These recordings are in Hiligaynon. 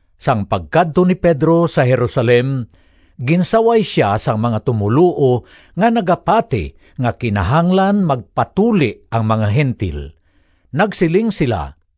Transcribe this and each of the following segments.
Sang pagkadto ni Pedro sa Jerusalem, ginsaway sia sang mga tumoluo nga nagapati nga kinahanglan magpatuli ang mga Gentil. Nagsiling sila,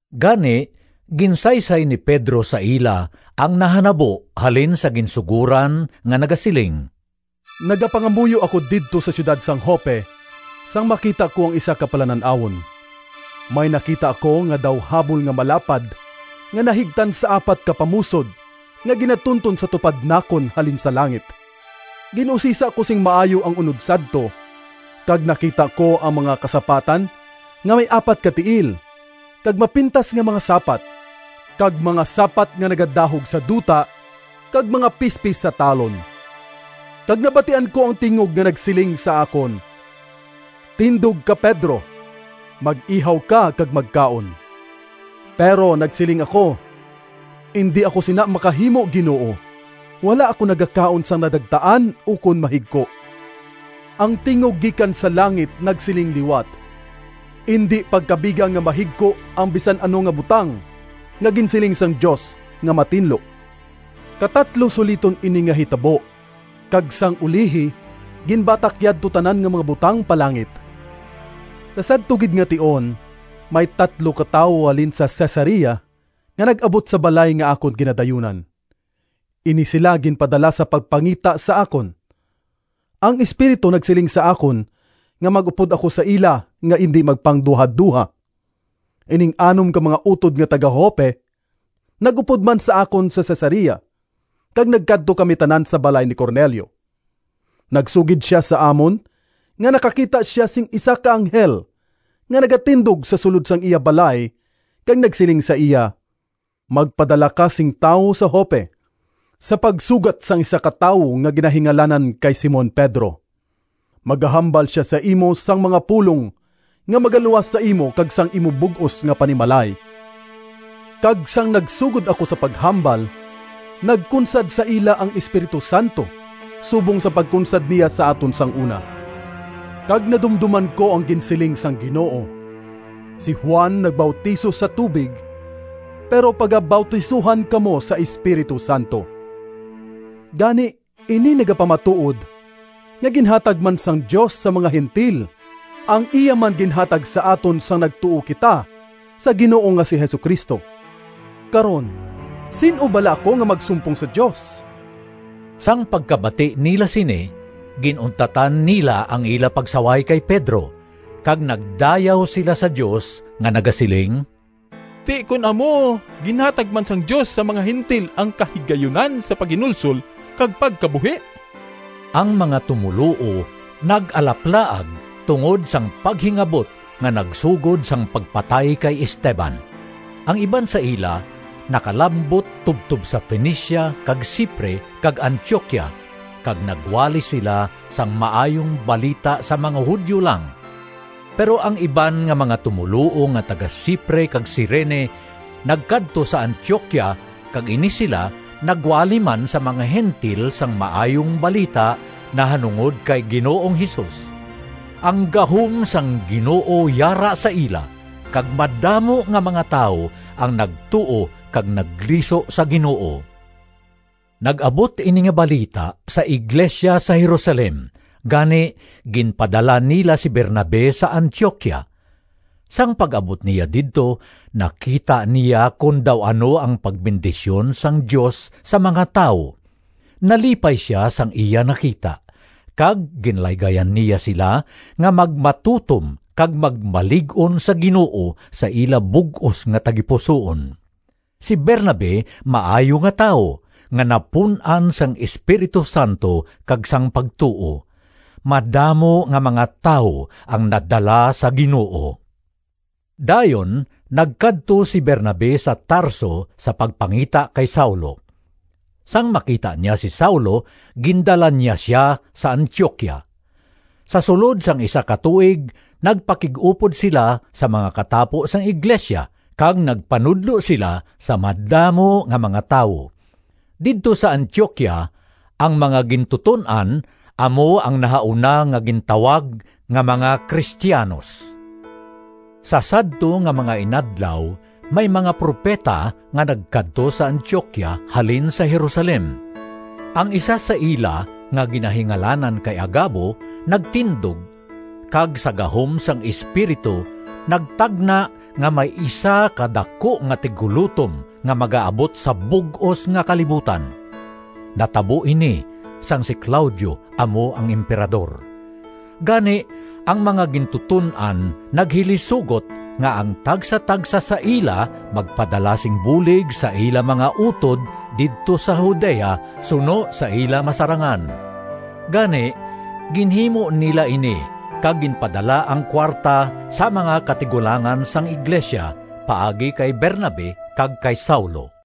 Gani ginsaysay ni Pedro sa ila ang nahanabo halin sa ginsugoran nga nagasiling: “Nagapangamuyo ako didto sa siyudad sang Joppe, sang makita ko ang isa ka palanan-awon. May nakita ako nga daw habol nga malapad nga nahigtan sa apat ka pamusod nga ginatunton sa tupad nakon halin sa langit. Gin-usisa ko sing maayo ang unod sadto, kag nakita ko ang mga kasapatan nga may apat ka tiil, kag mapintas nga mga sapat, kag mga sapat nga nagadahog sa duta, kag mga pispis sa talon. Kag nabatian ko ang tingog nga nagsiling sa akon, ‘Tindog ka Pedro, mag-ihaw ka, kag magkaon!’ Pero nagsiling ako, ‘Indi ako sina makahimo, Ginoo! Wala ako nagakaon sang nadagtaan ukon mahigko.’ Ang tingog gikan sa langit nagsiling liwat, ‘Indi pagkabiga nga mahigko ang bisan ano nga butang nga ginsiling sang Dios nga matinlo.’ Katatlo suliton ini nga hitabo, kag sang ulihi ginbatak yadto tanan nga mga butang pa langit. Sa sadto gid nga tion may tatlo ka tawo halin sa Cesarea nga nag-abot sa balay nga akon ginadayunan. Ini sila ginpadala sa pagpangita sa akon. Ang Espiritu nagsiling sa akon nga mag-upod ako sa ila nga indi magpangduhadoha. Ining anom ka mga utod nga taga-Joppe nag-upod man sa akon sa Cesarea kag nagkadto kami tanan sa balay ni Cornelio. Nagsugid sia sa amon nga nakakita sia sing isa ka anghel nga nagatindog sa sulod sang iya balay kag nagsiling sa iya, ‘Magpadala ka sing tawo sa Joppe sa pagsugat sang isa ka tawo nga ginahingalanan kay Simon Pedro. Magahambal sia sa imo sang mga pulong nga magaluwas sa imo kag sang imo bug-os nga panimalay.’ Kag sang nagsugod ako sa paghambal, nagkunsad sa ila ang Espiritu Santo subong sang pagkunsad niya sa aton sang una. Kag nadumdoman ko ang ginsiling sang Ginoo, ‘Si Juan nagbautiso sa tubig, pero pagabautisohan kamo sa Espiritu Santo.’ Gani ini nagapamatuod nga ginhatag man sang Dios sa mga Gentil ang iya man ginhatag sa aton sang nagtuo kita sa Ginoo nga si Jesu-Cristo. Karon sin-o bala ako nga magsumpong sa Dios?” Sang pagkabati nila sini, gin-untatan nila ang ila pagsaway kay Pedro, kag nagdayaw sila sa Dios nga nagasiling, “Ti kon amo, ginhatag man sang Dios sa mga Gentil ang kahigayunan sa paghinulsol kag pagkabuhi!” Ang mga tumoluo nag-alaplaag tungod sang paghingabot nga nagsugod sang pagpatay kay Esteban. Ang iban sa ila nakalambot tubtob sa Fenicia kag Cipre kag Antioquia, kag nagwali sila sang Maayong Balita sa mga Judio lang. Pero ang iban nga mga tumoluo nga taga-Cipre kag Cirene nagkadto sa Antioquia kag ini sila nagwali man sa mga Gentil sang Maayong Balita nahanungod kay Ginoong Jesus. Ang gahom sang Ginoo yara sa ila, kag madamo nga mga tawo ang nagtuo kag nagliso sa Ginoo. Nag-abot ini nga balita sa iglesia sa Jerusalem, gani ginpadala nila si Bernabe sa Antioquia. Sang pag-abot niya didto nakita niya kon daw ano ang pagbendisyon sang Dios sa mga tawo. Nalipay sia sang iya nakita, kag ginlaygayan niya sila nga magmatutom kag magmalig-on sa Ginoo sa ila bug-os nga tagipusoon. Si Bernabe maayo nga tawo, nga napun-an sang Espiritu Santo kag sang pagtuo. Madamo nga mga tawo ang nadala sa Ginoo. Dayon nagkadto si Bernabe sa Tarso sa pagpangita kay Saulo. Sang makita niya si Saulo, gindala niya sia sa Antioquia. Sa sulod sang isa ka tuig nagpakig-upod sila sa mga katapo sang iglesia kag nagpanudlo sila sa madamo nga mga tawo. Didto sa Antioquia ang mga gintuton-an amo ang nahauna nga gintawag nga mga Cristianos. Sa sadto nga mga inadlaw may mga propeta nga nagkadto sa Antioquia halin sa Jerusalem. Ang isa sa ila nga ginahingalanan kay Agabo nagtindog, kag sa gahom sang Espiritu nagtagna nga may isa ka daku nga tiggulotom nga magaabot sa bug-os nga kalibutan. (Natabo ini sang si Claudio amo ang Emperador.) Gani ang mga gintuton-an naghilisugot nga ang tagsatagsa sa ila magpadala sing bulig sa ila mga utod didto sa Judea suno sa ila masarangan. Gani, ginhimo nila ini kag ginpadala ang kuwarta sa mga katigulangan sang iglesia paagi kay Bernabe kag kay Saulo.